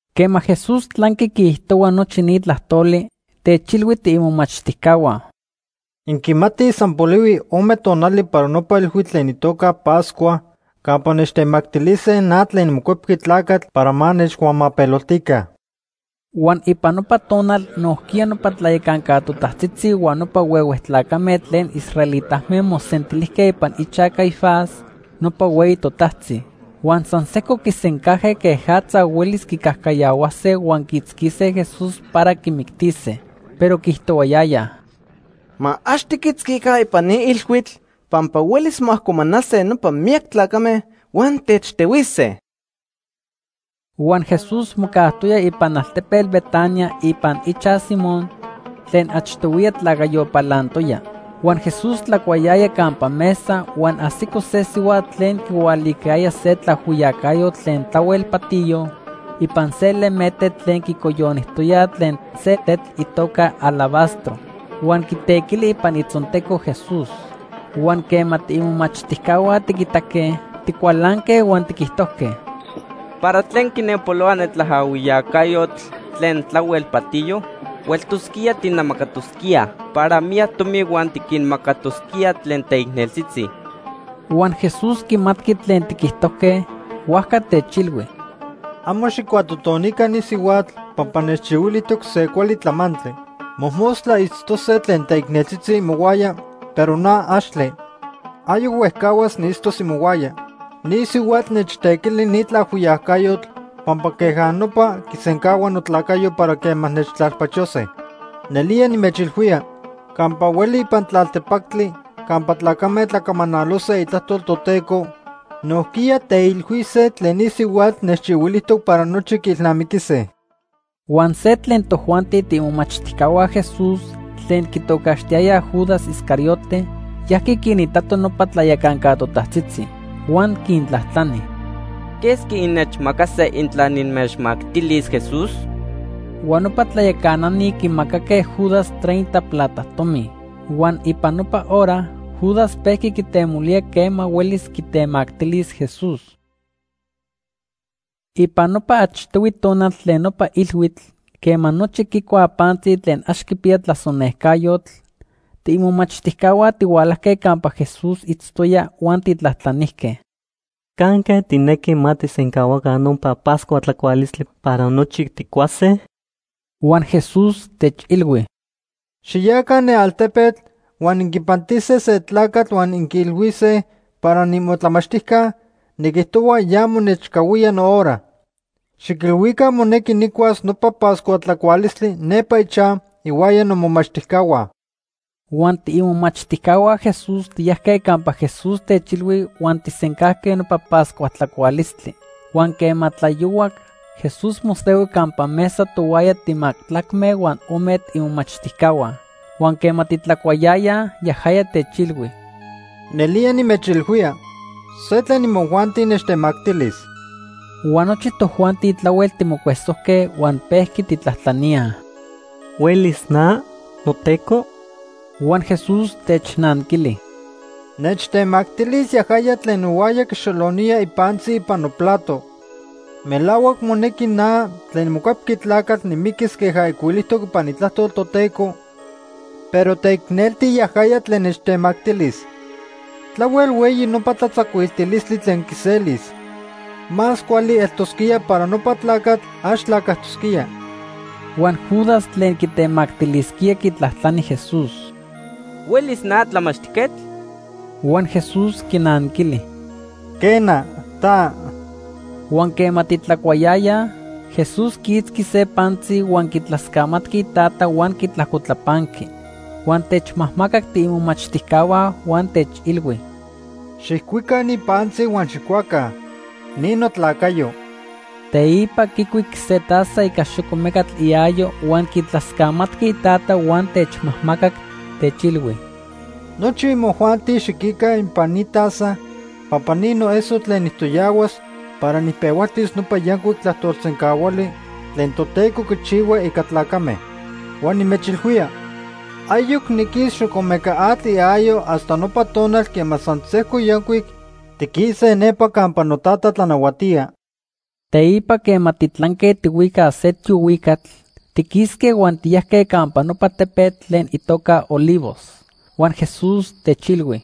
Quema Jesús tlanqui quiijtohua nochi ni tlajtoli, techilhui tiimomachtijcahua: ―Inquimatij san polihui ome tonali para nopa ilhuitl tlen itoca Pascua campa nechtemactilise na tlen niMocuepqui Tlacatl para ma nechcuamapeloltica. Huan ipan nopa tonal nojquiya nopa tlayacanca totajtzitzi huan nopa huehue tlacame tlen israelitame mosentilijque ipan ichaj Caifás, nopa hueyi totajtzi. Huan san sejco quisencajque quejatza huelis quicajcayahuase huan quiitzquise Jesús para quimictise. Pero quiijtohuayayaj: ―Ma ax tiquitzquica ipan ni ilhuitl pampa huelis moajcomanase nopa miyac tlacame huan techtehuise. Huan Jesús mocajtoya ipan altepetl Betania ipan ichaj Simón tlen achtohuiya tlacayo palantoya. Huan Jesús tlacuayaya campa mesa huan ajsico se sihuatl tlen quihualicayaya se tlaajhuiyacayotl tlen tlahuel patiyo ipan se lemete tlen quicoyonijtoya tlen se tetl itoca alabastro. Huan quitequili ipan itzonteco Jesús. Huan quema tiimomachtijcahua tiquitaque, ticualanque huan tiquijtojque: ―¿Para tlen quinenpolohua ne tlaajhuiyacayotl tlen tlahuel patiyo? Hueltosquía tijnamacatosquíaj para miyac tomi huan tiquinmacatosquíaj tlen teicneltzitzi. Huan Jesús quimatqui tlen tiquijtojque, huajca techilhui: ―Amo xijcuatotonica ni sihuatl pampa nechchihuilijtoc se cuali tlamantli. Mojmostla itztose tlen teicneltzitzi imohuaya, pero na axtle. Ayoc huejcahuas niitztos imohuaya. Ni sihuatl nechtequili ni tlaajhuiyacayotl pampa queja nopa quisencahua notlacayo para quema nechtlalpachose. Nelía nimechilhuía, campa hueli ipan tlaltepactli campa tlacame tlacamanalose itlajtol Toteco, nojquiya teilhuise tlen ni sihuatl nechchihuilijtoc para nochi quiilnamiquise. Huan se tlen tojuanti tiimomachtijcahua Jesús tlen quitocaxtiyayaj Judas Iscariote, yajqui quinitato nopa tlayacanca totajtzitzi. Huan quintlajtlani: ―¿Quesqui innechmacase intla nimechmactilis Jesús? Huan nopa tlayacanani quimacaque Judas treinta plata tomi. Huan ipan nopa hora Judas pejqui quitemolía quema huelis quitemactilis Jesús. Ipan nopa achtohui tonal tlen nopa ilhuitl, quema nochi quicuaj pantzi tlen ax quipiya tlasonejcayotl, tiimomachtijcahua tihualajque campa Jesús itztoya huan tijtlajtlanijque: ―¿Canque tijnequi ma tijsencahuaca nopa Pascua tlacualistli para nochi tijcuase? Huan Jesús techilhui: ―Xiyaca ne altepetl huan inquipantise se tlacatl huan inquiilhuise para niimotlamachtijca niquijtohua ya monechcahuía nohora. Xiquilhuica monequi nijcuas nopa Pascua tlacualistli nepa ichaj ihuaya nomomachtijcahua. Huan tiimomachtijcahua Jesús tiyajque campa Jesús techilhui huan tijsencajque nopa Pascua tlacualistli. Huan quema tlayohuac, Jesús mosehui campa mesa tohuaya timajtlacme huan ome tiimomachtijcahua. Huan quema titlacuayayaj, yajaya techilhui: ―Nelía nimechilhuía, se tlen imojuanti nechtemactilis. Huan nochi tojuanti tlahuel timocuesojque huan pejqui tijtlajtlaníaj: ―¿Huelis na, noTeco? Huan Jesús technanquili: ―Nechtemactilis yajaya tlen nohuaya quixolonía ipantzi ipan noplato. Melahuac monequi na tlen niMocuepqui Tlacatl nimiquis queja ijcuilijtoc ipan Itlajtol Toteco, pero teicnelti yajaya tlen nechtemactilis. Tlahuel hueyi nopa tlatzacuiltilistli tlen quiselis. Más cuali eltosquía para nopa tlacatl ax tlacajtosquía. Huan Judas tlen quitemactilisquía quitlajtlani Jesús: ―¿Huelis na, Tlamachtijquetl? Huan Jesús quinanquili: ―Quena, ta. Huan quema titlacuayayaj, Jesús quiitzqui se pantzi huan quitlascamatqui Itata huan quitlapanqui, huan techmajmacac tiimomachtijcahua huan techilhui: ―Xijcuica ni pantzi huan xijcuaca. Ni notlacayo. Teipa quicuic se taza ica xocomecatl iayo huan quitlascamatqui Itata huan techmajmacac, techilhui: ―Nochi imojuanti xiquica ipan ni taza, pampa ni noeso tlen nijtoyahuas para nijpehualtis nopa yancuic tlajtolsencahuali tlen Toteco quichihua ica tlacame. Huan nimechilhuía, ayoc niquis xocomecatl iayo hasta nopa tonal quema san sejco yancuic tiquise nepa campa noTata tlanahuatía. Teipa quema titlanque tihuicaj se tiohuicatl, tiquisque huan tiyajque campa nopa tepetl tlen itoca Olivos. Huan Jesús techilhui: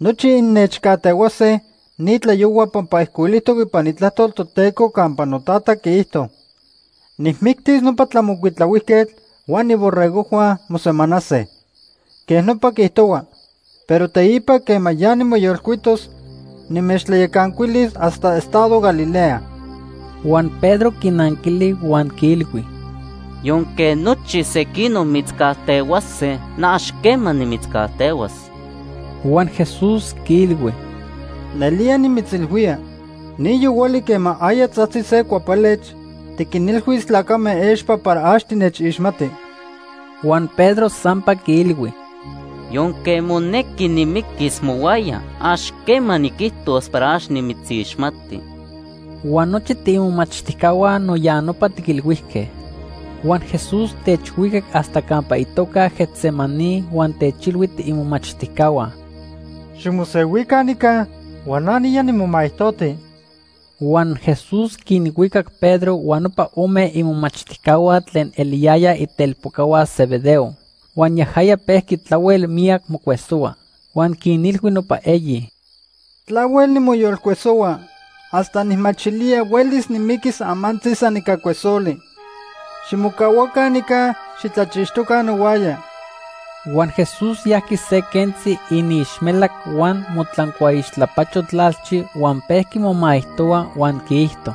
―Nochi innechcajtehuase ni tlayohua pampa ijcuilijtoc ipan Itlajtol Toteco campa noTata quiijto: ‘Nijmictis nopa tlamocuitlahuijquetl huan iborregojhua mosemanase.’ Quej nopa quiijtohua. Pero teipa quema ya nimoyolcuitos, nimechtlayacancuilis hasta estado Galilea. Huan Pedro quinanquili huan quiilhui: ―Yonque nochi sequinoc mitzcajtehuase, na ax quema nimitzcajtehuas. Huan Jesús quiilhui: ―Nelía nimitzilhuía, ni yohuali quema aya tzajtzi se cuapelech, tiquinilhuis tlacame expa para ax tinechixmati. Huan Pedro sampa quiilhui: ―Yonque monequi nimiquis mohuaya, ax quema niquijtos para ax nimitzixmati. Huan nochi tiimomachtijcahua no ya nopa tiquilhuijque. Huan Jesús techhuicac hasta campa itoca Getsemaní huan techilhui tiimomachtijcahua: ―Ximosehuica nica huan na niya nimomaijtoti. Huan Jesús quinhuicac Pedro huan nopa ome imomachtijcahua tlen eliyayaj itelpocahua Zebedeo. Huan yajaya pejqui tlahuel miyac mocuesohua. Huan quinilhui nopa eyi: ―Tlahuel nimoyolcuesohua hasta nijmachilía huelis nimiquis amantzi san ica cuesoli. Ximocahuaca nica. Xitlachixtoca nohuaya. Huan Jesús yajqui se quentzi iniixmelac huan motlancuaixtlapacho tlalchi huan pejqui momaijtohua huan quiijto: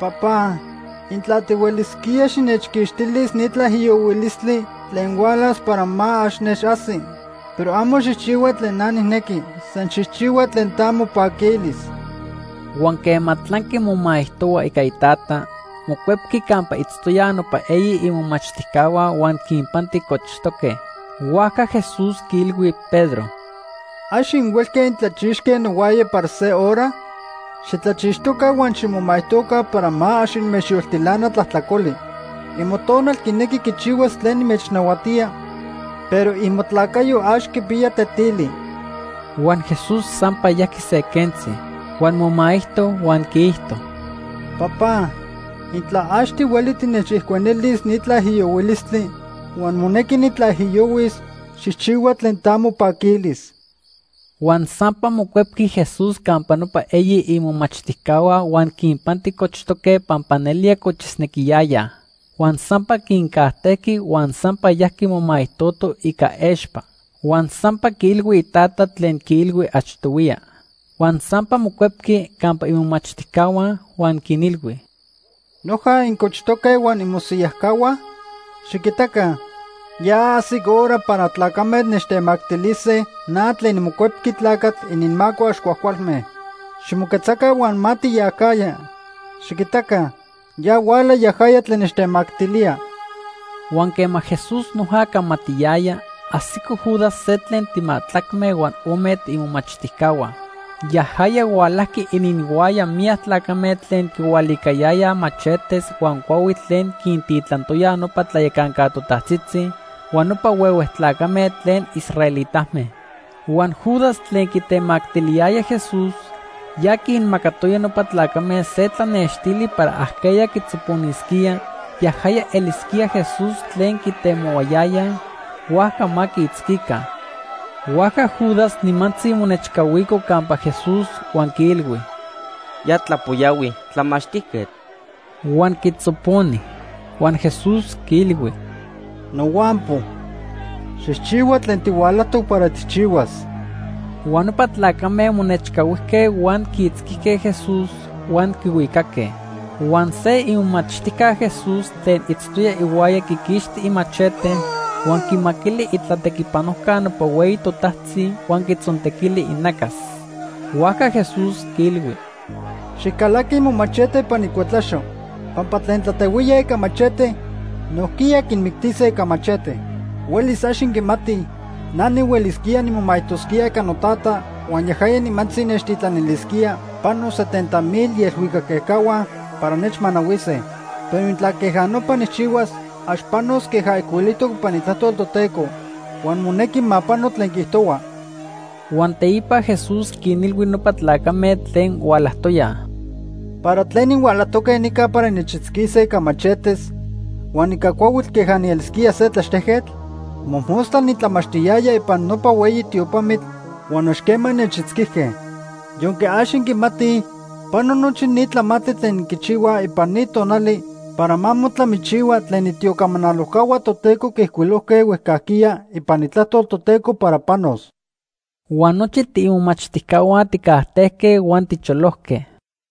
“Papá, intla tihuelisquía, xinechquixtilis ni tlaijiyohuilistli tlen hualas para ma ax nechajsi. Pero amo xijchihua tlen na nijnequi, san xijchihua tlen ta mopaquilis.” Huan quema tlanqui momaijtohua ica Itata, mocuepqui campa itztoyaj nopa eyi imomachtijcahua huan quinpanti cochtoque. Huajca Jesús quiilhui Pedro: ―¿Ax inhuelque intlachixque nohuaya para se hora? Xitlachixtoca huan ximomaijtoca para ma ax inmechyoltilana tlajtlacoli. Imotonal quinequi quichihuas tlen nimechnahuatía, pero imotlacayo ax quipiya tetili. Huan Jesús sampa yajqui se quentzi. Huan momaijto huan quiijto: “Papá, intla ax tihueli tinechijcuenilis ni tlaijiyohuilistli huan monequi nitlaijiyohuis, xijchihua tlen ta mopaquilis.” Huan sampa mocuepqui Jesús campa nopa eyi imomachtijcahua huan quinpanti cochtoque pampa nelía cochisnequiyayaj. Huan sampa quincajtejqui huan sampa yajqui momaijtoto ica expa. Huan sampa quiilhui Itata tlen quiilhui achtohuiya. Huan sampa mocuepqui campa imomachtijcahua, huan quinilhui: ―¿Noja incochtoque huan inmosiyajcahuaj? Xiquitaca, ya ajsic hora para tlacame nechtemactilise na tlen niMocuepqui Tlacatl ininmaco ax cuajcualme. Ximoquetzaca huan ma tiyacajya. Xiquitaca, ya huala yajaya tlen nechtemactilía. Huan quema Jesús noja camatiyaya, ajsico Judas se tlen timajtlacme huan ome tiimomachtijcahua. Yajaya hualajqui ininhuaya miyac tlacame tlen quihualicayayaj machetes huan cuahuitl tlen quintitlantoyaj nopa tlayacanca totajtzitzi huan nopa huehue tlacame tlen israelitame. Huan Judas tlen quitemactiliyaya Jesús, ya quinmacatoya nopa tlacame se tlanextili para ajqueya quitzoponisquía, yajaya elisquía Jesús tlen quitemohuayayaj, huajca ma quiitzquica. Huajca Judas nimantzi monechcahuico campa Jesús huan quiilhui: ―Ya tlapoyahui, Tlamachtijquetl. Huan quitzoponi. Huan Jesús quiilhui: ―Nohuampo, xijchihua tlen tihualajtoc para tijchihuas. Huan nopa tlacame monechcahuijque huan quiitzquijque Jesús, huan quihuicaque. Huan se imomachtijca Jesús tlen itztoya ihuaya quiquixti imachete, huan quimaquili itlatequipanojca nopa hueyi totajtzi huan quitzontequili inacas. Huajca Jesús quiilhui: ―Xijcalaqui momachete ipan icuetlaxo pampa tlen tlatehuíaj ica machete, nojquiya quinmictise ica machete. ¡Huelis ax inquimatij! Na nihuelisquía nimomaijtosquía ica noTata huan yajaya nimantzi nechtitlanilisquía pano setenta mil ielhuicac ejcahua para nechmanahuise. Pero intla queja nopa nijchihuas, ax panos queja ijcuilijtoc ipan Itlajtol Toteco. Huan monequi ma pano tlen quiijtohua. Huan teipa Jesús quinilhui nopa tlacame tlen hualajtoyaj: ―¿Para tlen inhualajtoque nica para innechitzquise ica machetes huan ica cuahuitl queja nielisquía se tlaxtejquetl? Mojmostla nitlamachtiyaya ipan nopa hueyi tiopamitl huan ax quema innechitzquijque. Yonque ax inquimatij pano nochi ni tlamantli tlen inquichihuaj ipan ni tonali para ma motlamichihua tlen itiocamanalojcahua Toteco quiijcuilojque huejcajquiya ipan Itlajtol Toteco para panos. Huan nochi tiimomachtijcahua tijcajtejque huan ticholojque.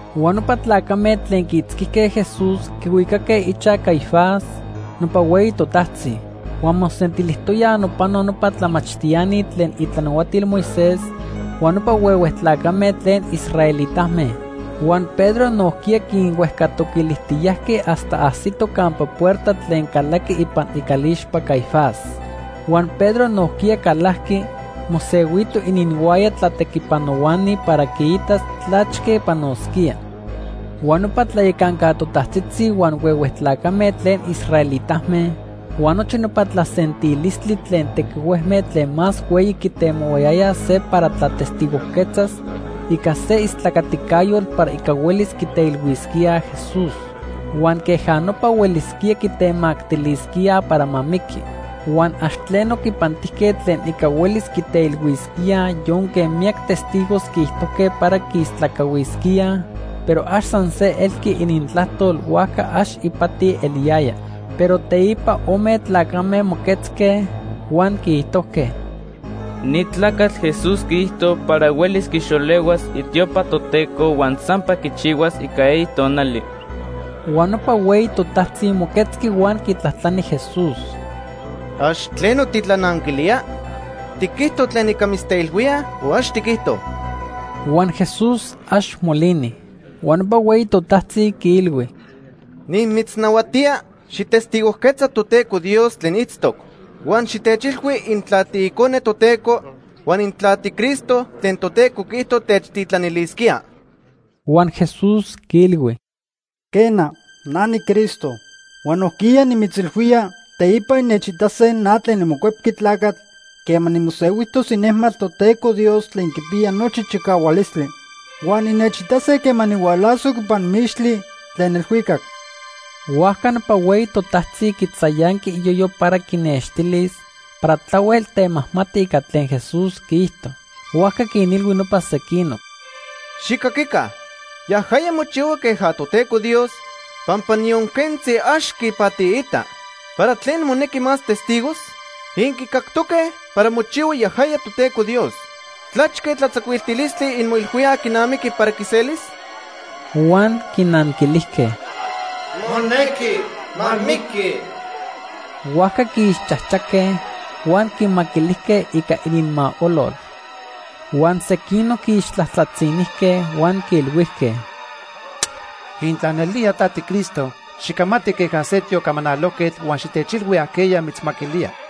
Huan nopa tlacame tlen quiitzquijque Jesús quihuicaque ichaj Caifás, nopa hueyi totajtzi. Huan mosentilijtoyaj nopano nopa tlamachtiani tlen itlanahuatil Moisés huan nopa huehue tlacame tlen israelitame. Huan Pedro nojquiya quinhuejcatoquilijtiyajqui hasta ajsitoj campa puerta tlen calaqui ipan icalixpa Caifás. Huan Pedro nojquiya calajqui, mosehuito ininhuaya tlatequipanohuani para quiitas tlachque panosquía. Huan nopa tlayacanca totajtzitzi huan huehue tlacame tlen israelitame huan nochi nopa tlasentilistli tlen tequihuejme tlen más hueyi quitemohuayayaj se para tlatestigojquetzas ica se istlacaticayotl para ica huelis quiteilhuisquíaj Jesús. Huan queja nopa huelisquía quitemactilisquíaj para ma miqui. Huan ax tleno quipantijque tlen ica huelis quiteilhuisquíaj yonque miyac testigos quiijtojque para quiistlacahuisquíaj, pero ax san se elqui inintlajtol huajca ax ipati eliyaya. Pero teipa ome tlacame moquetzque, huan quiijtojque: ―Ni tlacatl Jesús quiijto para huelis quixolehuas itiopa Toteco huan sampa quichihuas ica eyi tonali. Huan nopa hueyi totajtzi moquetzqui huan quitlajtlani Jesús: ―¿Ax tleno titlananquilía? ¿Tiquijto tlen ica mitzteilhuíaj o ax tiquijto? Huan Jesús ax molini. Huan nopa hueyi totajtzi quiilhui: ―Nimitznahuatía xijtestigojquetza Toteco Dios tlen itztoc. Huan xitechilhui intla tiIcone Toteco huan intla tiCristo tlen Toteco quiijto techtitlanilisquía. Huan Jesús quiilhui: ―Quena, na niCristo. Huan nojquiya nimitzilhuía, teipa innechitase na tlen niMocuepqui Tlacatl quema nimosehuijtos inejmatl Toteco Dios tlen quipiya nochi chicahualistli. Huan innechitase quema nihualasoc ipan mixtli tlen elhuicac. Huajca nopa hueyi totajtzi quitzayanqui iyoyo para quinextilis para tlahuel temajmati ica tlen Jesús quiijto. Huajca quinilhui nopa sequinoc: ―Xijcaquica, yajaya mochihua queja Toteco Dios pampa niyon quentzi ax quipatiita. ¿Para tlen monequi más testigos? Inquicactoque para mochihua yajaya Toteco Dios. ¿Tlachque tlatzacuiltilistli inmoilhuíaj quinamiqui para quiselis? Huan quinanquilijque: ―Monequi ma miqui. Huajca quiixchajchaque, huan quimaquilijque ica ininmaolol. Huan sequinoc quiixtlajtlatzinijque huan quiilhuijque: ―Intla nelía ta tiCristo, xicamati queja se tiocamanalojquetl huan xitechilhui ajqueya mitzmaquilía.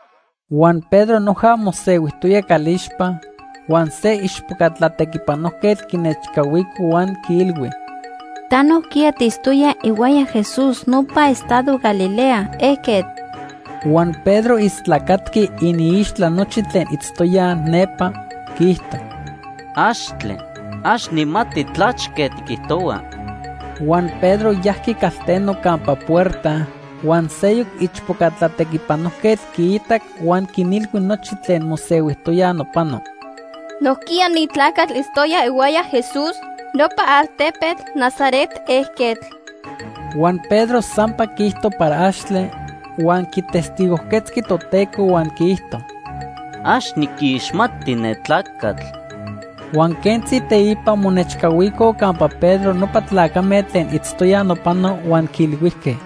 Huan Pedro noja mosehuijtoya calixpa huan se ichpoca tlatequipanojquetl quinechcahuico huan quiilhui: ―Ta nojquiya tiitztoya ihuaya Jesús nopa estado Galilea ejquetl. Huan Pedro istlacatqui iniixtla nochi tlen itztoyaj nepa. Quiijto: ―Axtle, ax nijmati tlachque tiquijtohua. Huan Pedro yajqui calteno campa puerta huan seyoc ichpoca tlatequipanojquetl quiitac huan quinilhui nochi tlen mosehuijtoyaj nopano: ―Nojquiya ni tlacatl itztoya ihuaya Jesús, nopa altepetl Nazaret ejquetl. Huan Pedro sampa quiijto para axtle, huan quitestigojquetzqui Toteco huan quiijto: ―Ax niquixmati ne tlacatl. Huan quentzi teipa monechcahuicoj campa Pedro nopa tlacame tlen itztoyaj nopano huan quiilhuijque: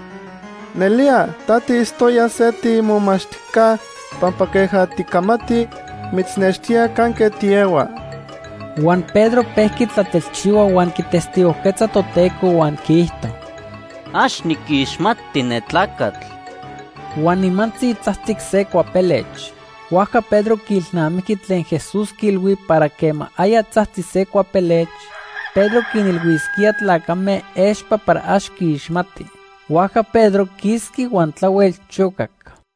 ―Nelía ta tiitztoya se tiimomachtijca pampa queja ticamati mitznextía canque tiehua. Huan Pedro pejqui tlatelchihua huan quitestigojquetza Toteco huan quiijto: ―Ax niquixmati ne tlacatl. Huan nimantzi tzajtzic se cuapelech. Huajca Pedro quiilnamijqui tlen Jesús quiilhui para quema aya tzajtzi se cuapelech, Pedro quinilhuisquíaj tlacame expa para ax quiixmati. Huajca Pedro quisqui huan tlahuel chocac.